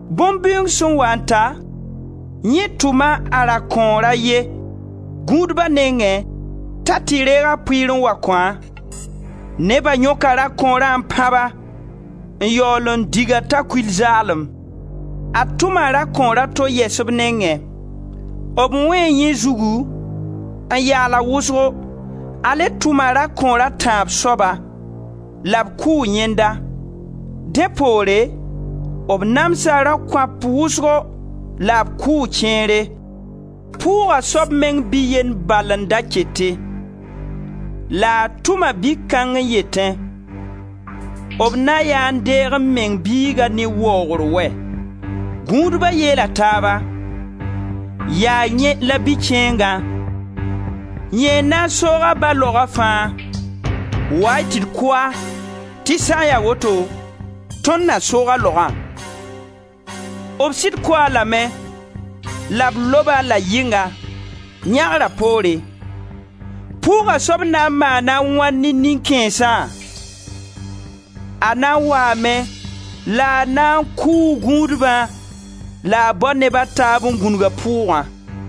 Bõn-bɩʋʋng sẽn waa n ta, yẽ tʋma a rakõor a ye gũudba nengẽ t'a tɩ reeg a pʋɩɩr n wa kõ-a. Neba yõka rakõorã n pãb-a, n yaool n dig-a t'a kul zaalem. A tʋma rakõor a to yɛs b nengẽ. B wẽe yẽ zugu, n yaal-a wʋsgo. A le tʋma rakõor a tãab soaba, la b kʋʋ yẽnda. Dẽ poore, b namsa rakõap wʋsgo la b kʋʋ kẽere. Pʋʋga soab meng bi-yend bala n da kete, la a tʋma bi-kãng n yetẽ: B na yaa n deeg m meng biigã ne waoogre wɛ! Gũudba yeela taaba: Yaa yẽ la bi-kẽengã, yẽ n na n soog a ba laoga fãa. Wa-y tɩ d kʋ-a, tɩ sã n ya woto, tõnd na soog a laogã. B sɩd kʋ-a lame la b lob-a la yɩnga, yãgra poore. Pʋʋga soab na n maana a wãn ne nin-kãensã? A na n waame la a na n kʋʋ gũudbã la a bao neb a taab n gũnug a pʋʋgã.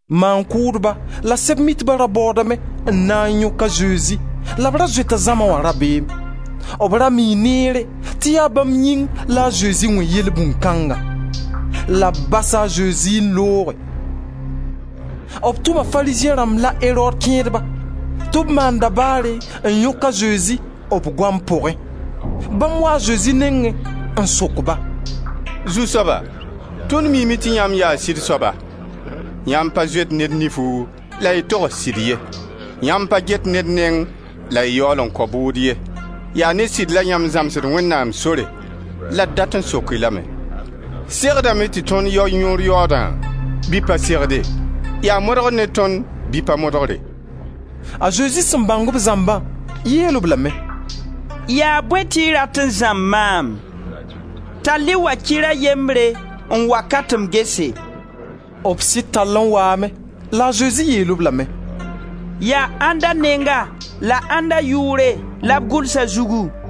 Maan-kʋʋdba la Sɛb-mitba ra baoodame n na n yõk a Zezi la b ra zoeta zãma wã rabeem. B ra mii neer tɩ yaa bãmb yĩng la a Zezi wẽ yelbũnd kãnga. La b basa a Zezi n looge. B tʋma Farizẽ rãmb la a Erod kẽedba tɩ b maan dabaare n yõk a Zezi b goam pʋgẽ. Bãmb waa a Zezi nengẽ n sok-ba: «Zu-soaba, tõnd miime tɩ yãmb yaa sɩd soaba. Yãmb pa zoet ned nifu la y togs sɩd ye. Yãmb pa get ned neng la y yaool n kao bʋʋd ye. Yaa ne sɩd la yãmb zãmsd Wẽnnaam sore. La d dat n sok-y lame: Segdame tɩ tõnd yao yõor yaoodã bɩ pa segde? Yaa modgr ne tõnd bɩ pa modgre?» A Zezi sẽn bãng b zãmbã, yeel-b lame: «Yaa bõe tɩ y rat n zãmb maam? Tall-y wakɩr a yembre n wa ka tɩ m gese.» B sɩd tall n waame. La a Zezi yeel-b lame: «Yaa ãnda nenga la ãnda yʋʋre la b gʋls a zugu?»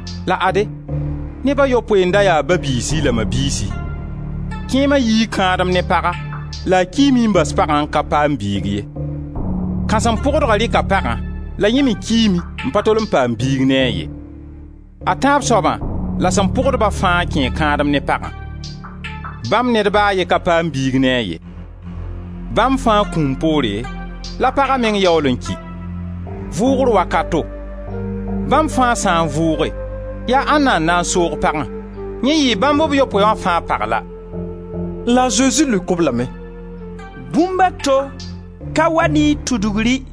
La ade, neb a yopoe n da ya ba-biisi la ma-biisi. Kẽema yii kãadem ne paga, la a kiime n bas pagã n ka paam biig ye. Kãsem-pʋgdgã rɩka pagã la yẽ me kiime n pa tol n paam biig ne-a ye. A tãab soaba la sẽn pʋg-ba fãa kẽe kãadem ne pagã; bãmb ned ba a ye ka paam biig ne-a ye. Bãmb fãa kũum poore la paga meng yaool n ki. Vʋʋgr wakato, bãmb fãa sã n vʋʋge, yaa ãnda n na n soog pagã? Yẽ yɩɩ bãmb b yopoe wã fãa pag la.» La a Zezi leok-b lame: «Bũmb a to ka wa ne y tudgri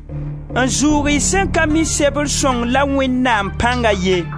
n zʋʋg y sẽn ka mi Sebr sõng la Wẽnnaam pãnga ye.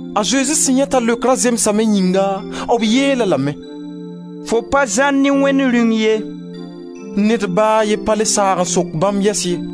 A Zezi sẽn yãe t'a leokra zemsame yĩnga, b yeel-a lame: «Fo pa zãr ne Wẽnd Rĩung ye.» Ned ba a ye pa le saag n sok bãmb yɛs ye.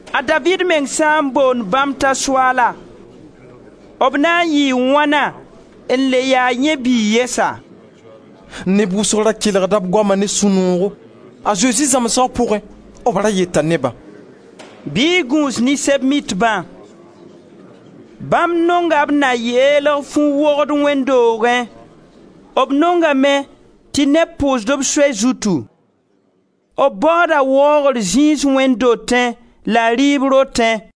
A Daviid meng sã n boond bãmb t'a Soaala, b na yɩɩ wãna n le ya yẽ biig yɛsa?» Neb wʋsgo da kelgda b goama ne sũ-noogo. A Zezi zãmsga pʋgẽ, b ra yeta nebã: «Bɩ y gũus ne Sɛb-mitbã. Bãmb nonga b na yeelg fu-wogd wẽnd doogẽ, b nongame tɩ neb pʋʋs-b soy zutu, b baooda waoogr zĩis wẽnd dotẽ la rɩɩb rotẽ.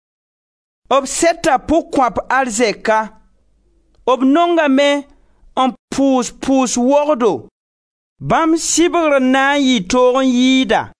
B sɛta pʋg-kõap arzɛka. B nongame n pʋʋs pʋʋs wogdo. Bãmb sɩbgr n na n yɩ toog n yɩɩda.»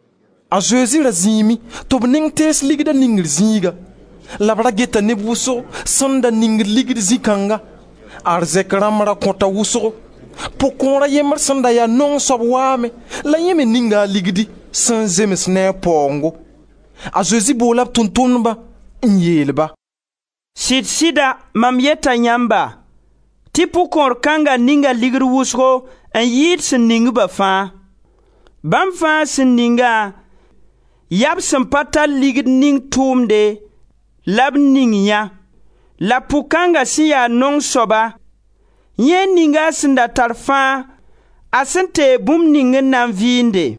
A Zezi da zĩime tɩ b neng tees ligda ningr zĩiga la b ra geta neb wʋsgo sẽn da ningd ligd zĩ kãnga. Arzɛk rãmba ra kõta wʋsgo. Pʋg-kõor a yembr sẽn da ya naong soab waame la yẽ me ninga ligdi sẽn zems ne a paoongo. A Zezi boola b Tʋʋm-tʋmdba n yeel-ba: «Sɩd-sɩda mam yeta yãmba tɩ pʋg-kõor kãnga ninga ligd wʋsgo n yɩɩd sẽn ning-ba fãa. Bãmb fãa sẽn ningã, yaa b sẽn pa tar ligd ning tʋʋmde la b ning yã la pʋg kãnga sẽn ya naong soaba, yẽ ninga a sẽn da tar fãa, a sẽn teeg bũmb ning n na n vɩɩnde.»